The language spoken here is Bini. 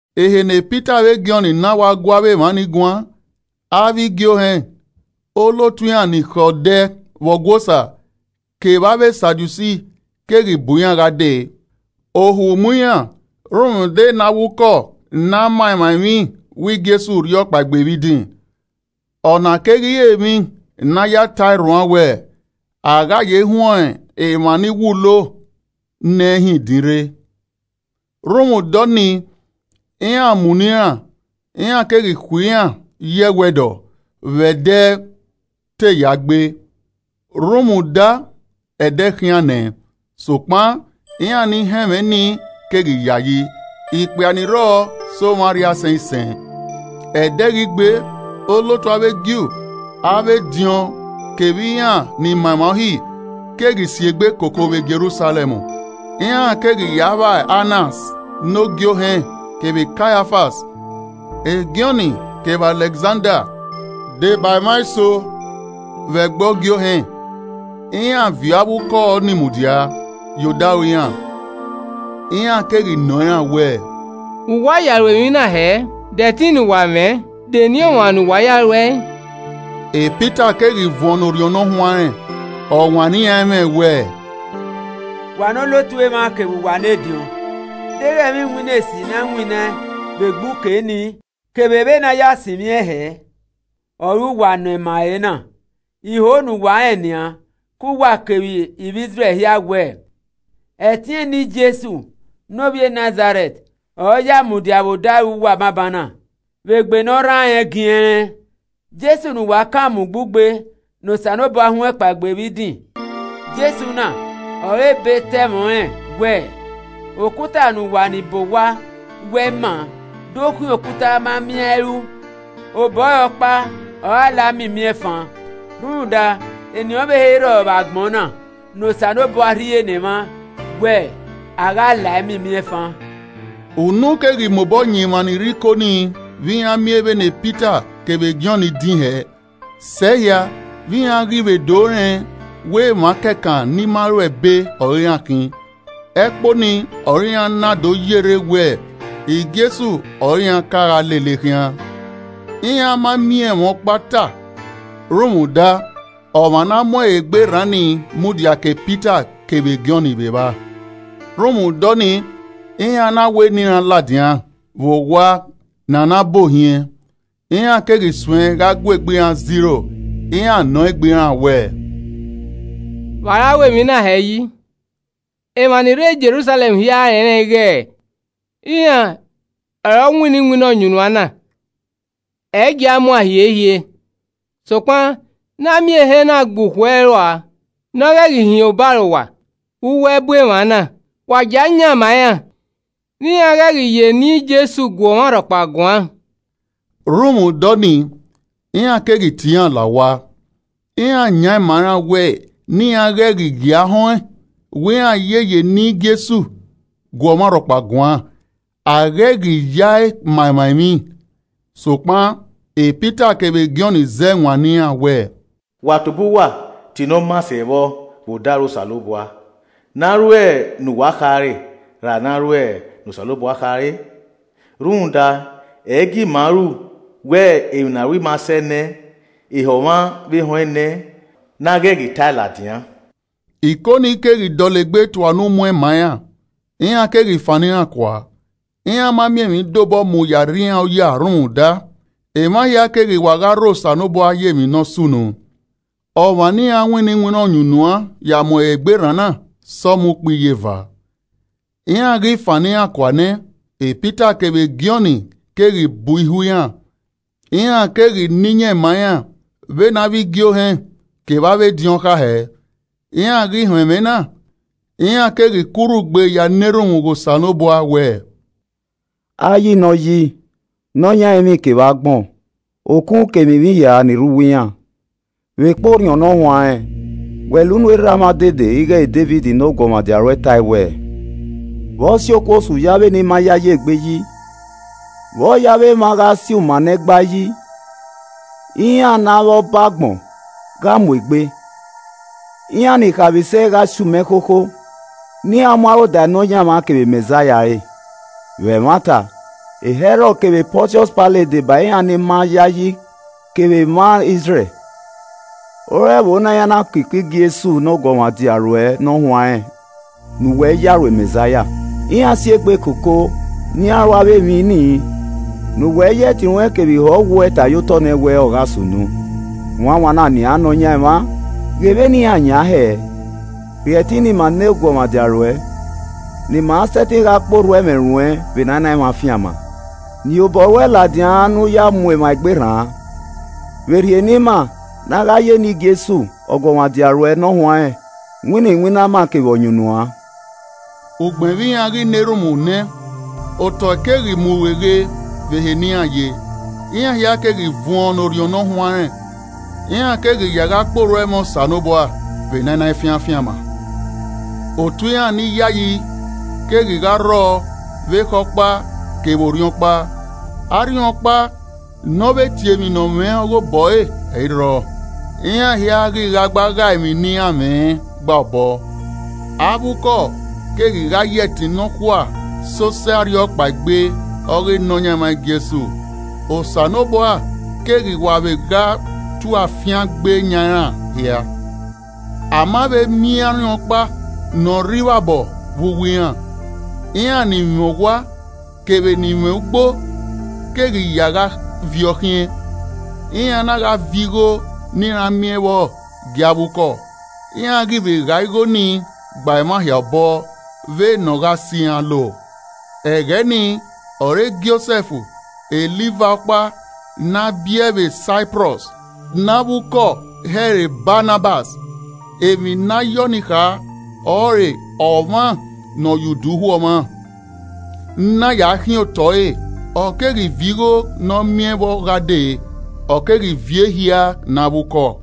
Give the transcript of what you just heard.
Ehe ne Pita vbe Jọn na wa gu avbe emwa ni guan, avbe igie ohẹn, olotu iran ni khẹ odẹ vbe Ọgua Osa, kevbe avbe Sadusi keghi bu iran gha dee. Ohu mu iran rhunmwuda ne avbe ukọ na ma avbe emwa ni emwi wẹ Jesu rhiọkpaegbe vbe idin, ọna keghi re emwi ne a ya ta ẹe rhuan wẹ, a gha ye huẹn emwa ni wulo nẹ hin idin rre. Rhunmwuda ọnii, iran mu nọ iran, iran keghi khui iran ye ẹwẹdọ vbe ẹdẹ te ya gbe, rhunmwuda ẹdẹ khian nẹ. Sokpan iran ni họn ẹmwẹ nii keghi yayi, ikpia ni rrọọ sẹ omwa arriaisẹn isẹn. Ẹde ghi gbe, olotu avbe Ju, avbe ediọn, kevbe iran ni ma emwa Uhi, keghi si egbe koko vbe Jerusalẹm. Iran keghi ya vba Anas ne ogie ohẹn kevbe Kaiafas, Jọn kevbe Alẹkzanda deba emwa eso vbe ẹgbẹe ogie ohẹn. Iran viọ avbe ukọ ni mudia ye odaro iran, iran keghi nọ iran wẹẹ, “Vbe uwa ya ru emwi na hẹ? De ẹtin ne uwa mwẹ? de eni ọmwa ne uwa ya ruẹe?” Pita keghi vuọn ne Orhiọn Ne Ọ Huanrẹn, ọ wanniẹn iran ẹmwẹ wẹẹ, “Wa ne olotu emwa kevbe uwa ne ediọn. Deghẹ ẹmwẹ iwinna esi ne a winnaẹn vbe egbe uke ni, kevbe vbene a ya sinmwi ẹn hẹ, ọre uwa nọ ima ẹre na, I ho ne uwa rẹn nian, ke uwa kevbe ivbi Izrẹl hia wẹẹ, ẹtin eni Jesu ne ovbi Nazarẹt ọre ọ ya mudia vbe odaro uwa banbanna, vbe egbe ne ọ rran rẹn giẹnrẹn. Jesu ne uwa kan mu ugbugbe, ne Osanobua huẹn kpaegbe vbe idin. Jesu na ọre ebe ta ẹmwẹ ọnrẹn wẹẹ, “ ‘Okuta ne uwa ni bọ owa wẹ, ẹ i maa do khian okuta a ma miẹn a i ru.’ Obọ ẹre ọkpa ọre a la miẹn imiẹnfan rhunmwuda eni ọvbehe i rrọọ, vbe agbọn na, ne Osanobua rhie ne emwa wẹ a gha lae miẹn imiẹnfan.” Unu keghi mobọ yan emwa ni rre Iko nii vbe iran miẹn vbene Pita kevbe Jọn din hẹ, sẹe hia vbe iran ghi vbe do rẹn wẹ emwa kẹkan ni ma ruẹ ebe ọre iran khin. Ẹkpo nii ọre iran na do yerre wẹ Jesu ọre iran ka gha lele khian. Iran ma miẹn ẹmwẹ ọkpa ta, rhunmwuda ọmwa ne a mu ẹre egbe rran nii, mudia ke Pita kevbe Jọn vbe evba. Rhunmwuda ọnii, iran na wẹ ne iran ladian vbe owa ne a na bu ohiẹn. Iran keghi suẹn gha gu egbe iran zẹ iro. Iran nọ egbe iran wẹẹ, “Vbe a ra ru emwi na hẹ yi? Emwa ni rre Jerusalẹm hia rẹnrẹn ighẹ iran ọre ọ winna iwinna ọyunnuan na, ẹ i gia muan hiehie. Sokpan ne a miẹn ehe na gbe ukhu ẹre ua, ne ọ ghẹ hin obarowa vbe uwu ẹbu emwa na, wa gie a yan ma iran ne iran ghẹ ghi ya eni Jesu gu ọmwa rhọkpa guan.” Rhunmwuda ọnii, iran keghi tie iran la owa, iran yan ma iran wẹ ne iran ghẹ gie a họn ẹn wẹ iran ye ya eni Jesu gu ọmwaikọmwa guan, a ghẹ i ghi ya ẹe ma emwa emwi. Sokpan Pita kevbe Jọn zẹ wanniẹn iran wẹ, “Wa tobọ uwa ta ne ọ maa sẹ vbọ vbe odaro Osanobua, ne a ru ne uwa khare ra ne a ru ne Osanobua khare? Rhunmwuda, ẹ i gie ima ru wẹ emwi ne aro ima sẹe nẹ, ehọ mwa vbe họn ẹn nẹ, ne a ghẹ ghi ta ẹe ladian.” Iko ni keghi dọlegbe tua unu muẹn ma iran, iran keghi fannọ iran kua. Iran ma miẹn emwi de obọ mu ya rri iran oya rhunmwuda, emwa hia keghi wa gha rho Osanobua ye emwi ne ọ sunu. Ọmwa ne iran winna ọyunnuan ya mu ẹre egbe rran na sẹ ọmọ ukpo iyeva. Iran ghi fannọ iran kua nẹ, Pita kevbe Jọn keghi bu ihua iran, iran keghi na iyẹn ma iran vbene avbe igie ohẹn kevba avbe ediọn kha hẹ. Iran ghi họn ẹmwẹ na, iran keghi ku urhu gbe ya na erhunmwu ghe Osanobua wẹẹ, “Ayi ne Ọ yi, nọ yan ẹrinmwi kevbe agbọn, okun kevbe emwi hia ni re uwu iran. Vbekpa Orhiọn Ne Ọ Huanrẹn, wẹ la unu erha mwa odede ighẹ Devid ne ọguọmwadia ruẹ ta ẹe wẹẹ, “ ‘Vbe ọ si okuosu ye avbe Ni ma yayi egbe yi? Vbe ọ ye avbe emwa gha si uma ne ẹ i gba yi? Iran ne avbe ọba agbọn gha mu egbe, iran ni khaemwisẹ gha si uma ẹkhokho, ne iran mu aro da Nọyaẹnmwa kevbe Mẹzaia ẹre.’ Vbe ẹmwata, Hẹrọd kevbe Pọntiọs Pailet deba iran Ni ma yayi kevbe emwa Izrẹl, ore ẹvbo na iran na ko iko Jesu ne Ọguọmwadia ruẹ Ne ọ huanrẹn ne uwẹ ya ru Mẹzaia. Iran si egbe koko, ne iran ru avbe emwi ni ne uwẹ ya ẹtin ruẹn kevbe iho ọwuẹ ta ye otọ nẹ wẹẹ, ọ gha sunu. Wanwan na nian Nọyaẹnmwa, ghe vbene iran yan hẹẹ, rhie ẹtin ne ima ne eguọmwadia ruẹ, ne ima sẹtin gha kpe orhu ẹmwẹ ruẹn vbe ne a i na fian afianma. Nien obọ ruẹ ladian ne u ya ẹe mu emwa egbe rran, vbe rhie ne ima ne a gha ye eni Jesu, Ọguọmwadia ruẹ ne ọ huanrẹn winna iwinna ama kevbe ọyunnuan.” Ugbẹn vbe iran ghi na erhunmwu nẹ, otọe keghi mu rueghe vbe ehe ne iran ye, iran hia keghi vuọn ne Orhiọn Ne Ọ Huanrẹn, iran keghi ya gha kpe orhu ẹmwẹ Osanobua vbe ne a i na fian afianma. Otu iran ni yayi keghi gha rrọọ vbe ekhọe ọkpa kevbe orhiọn ọkpa. Arhiọnkpa ne ọ vbe tie emwi ne ọ mwẹ ọghe obọ ẹre, ẹ i rrọọ. Iran hia ghi gha gba ghae emwi ne iran mwẹ, ọ gba obọ. Avbe ukọ keghi gha ya ẹtin nọkhua sẹ osẹe arhiọkpaegbe ọghe Nọyaẹnmwa Jesu. Osanobua keghi wa vbe gha tue afiangbe yan iran hia. A ma vbe miẹn arhiọnkpa ne ọ rre ivbabọ vbe uwu iran. Iran ni mwẹ owa kevbe ni mwẹ ugbo keghi ya gha viọ khiẹn. Iran na gha viọ igho ne iran miẹn vbọ gie avbe ukọ, iran ghi vbe gha igho ni gba emwa hia obọ, vbe ne ọ gha sẹ iran lo. Ẹghẹ ni ọre Josẹf, e Livai ọkpa ne a biẹe vbe Saiprọs, ne avbe ukọ he ẹre Banabas (emwi ne a ye ọnii kha ọre ọmwa ne ọ ye udu hu ọmwa,) na ya khiẹn otọ ẹre, ọ Keghi viọ igho ne ọ miẹn vbọ gha dee, ọ keghi viọ ehia ne avbe ukọ.